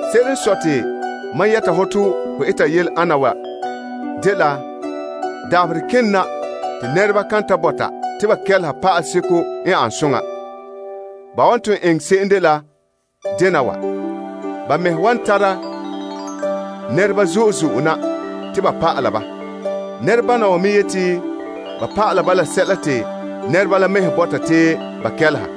Se'ere n sɔe te mam yɛta hɔ te ho eta yele ana wa dela dabaherɛ kena te nɛreba kan ta bɔta te ba kɛleha pa'aleseko n ane soŋa. Ban wan ton eŋɛ se'em dela dena wa, ba mɛhe wan tare nɛreba zo'e zo'e na te ba pa'ala ba. Nɛrebana wa me yeti ba pa'alɛ ba la sɛla te nɛreba la mɛhe bɔta te ba kelehe.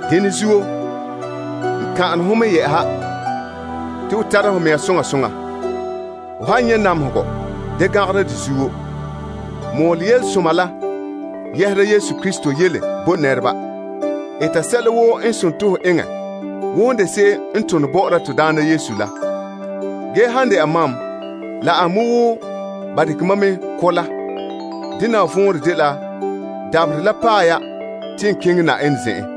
Dene zuo, n kan'ane ho mɛ yɛ'ɛha te ho tara ho mea soŋa soŋa. Ho han nyɛ' namehegɔ, ŋmibe. Mɔɔlɛ Yelesoma ge eta sɛla woo n sone te ho eŋɛ wo hon de se'em n tone bɔ'ɔra Yenɛ. Ge han dɛna mam, la an me wo ba dekɛ mam mɛ ko' la. Dena wa vɔnrɛ dela dabaherɛ la paɛ ya te n keŋɛ Yenɛ zen'en.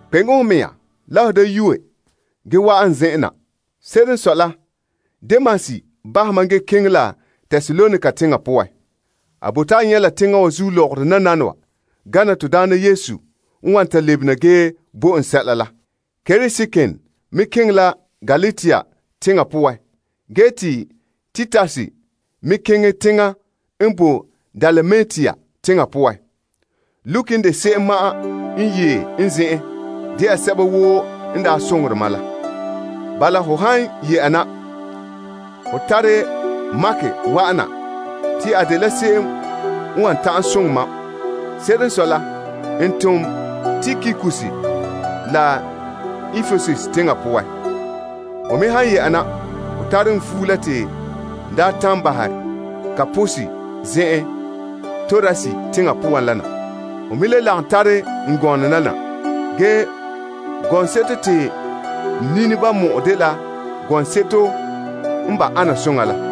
Kpeŋe ho mɛŋa la ho da yuue ge wa'an n zen'en na. Se'ere n sɔe la, Demas bahɛ mam ge keŋɛ la Tesalonika teŋa poan. A bote a nyɛ' la teŋa wa zuo lɔgɔrɔ nananawa gana Yesu n wan ta lebena ge bo en sɛla la. Kreskens me keŋɛ la Galatia teŋa poan ge te Titus keŋɛ Dalmatia teŋa poan. Luke n de se'em ma'an n yee n zen'en de'a sɛba woo n daa soŋore mam la. Bala, ho han yɛ'ɛha na, ho tare Mark wa'ana te a dela se'em n wan ta'an soŋɛ mam. Se'ere n sɔe la, n tom Tikikus la Epesus teŋa poan. Ho me han yɛ'ɛha na, ho tare fuo la te n daa bahɛ Karpus zen'en Troas teŋa poan la na. Ho me lagom tare n gɔnɔ la na, la gɔŋseto n kilom la, la seto n de koyena koyena la.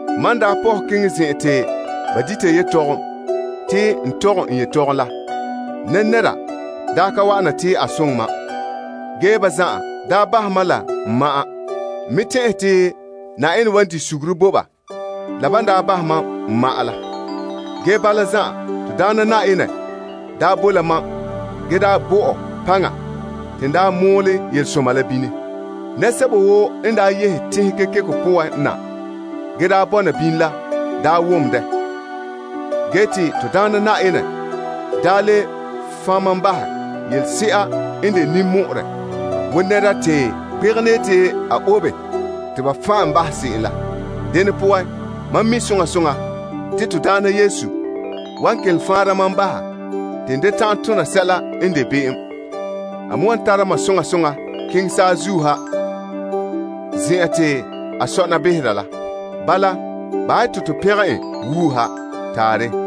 Mam n daa pɔhɛ keŋɛ zen'an te ba dita yetɔgom te n tɔgɛ n yetɔgom la, nɛnɛra daa ka wa'an na te a soŋɛ mam, ge ba zan'an daa bahɛ mam la n ma'an. N me tɛn'ɛhe te Yenɛ wan di' suguru bo ba la ban daa bahɛ mam n ma'an la. Ge bala zan'an, Na'ayenɛ daa bo la mam ge daa bo mam paŋa te n daa mɔɔlɛ yelesoma la bini. Nɛresɛba woo n daa yehe teŋhe kekeko poan na ge daa bɔna bini la daa wom dɛ. Ge te Na'ayenɛ daa le fan' mam bahɛ yelese'a n de ninmɔ'ɔrɛ wo nɛra te gbegenɛ yeti a obe te ba fan' en bahɛ se'em la. Dene poan, mam mi' soŋa soŋa te Na'ayenɛ wan kelom faanra mam baha te n da ta'an tona sɛla n de be'em. A me wan tara mam soŋa soŋa keŋɛ saazuo ha zen'an te a sɔna behera la. Bala, bahɛ ya te to pɛngɛ en wuuha. Taarɛ.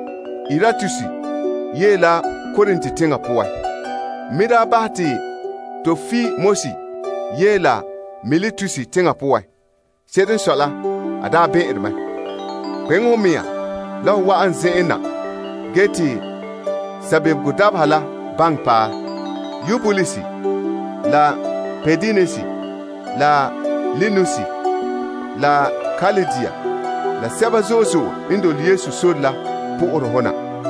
Erastus yee la Korint teŋa poan. N me daa bahɛ te Tropimus yee la Miletus teŋa poan. Se'ere n sɔe la, a daa bɛn'ɛnrɛ mɛ. Kpeŋe ho mea la ho wa'an n zen'en na ge te sabebego dabeha la baŋɛ paɛ. Eubulus, la Pudens, la Linus, la Klaudia, la sɛba zo'e zo'e n dole Yesu sore la po'ohere ho na.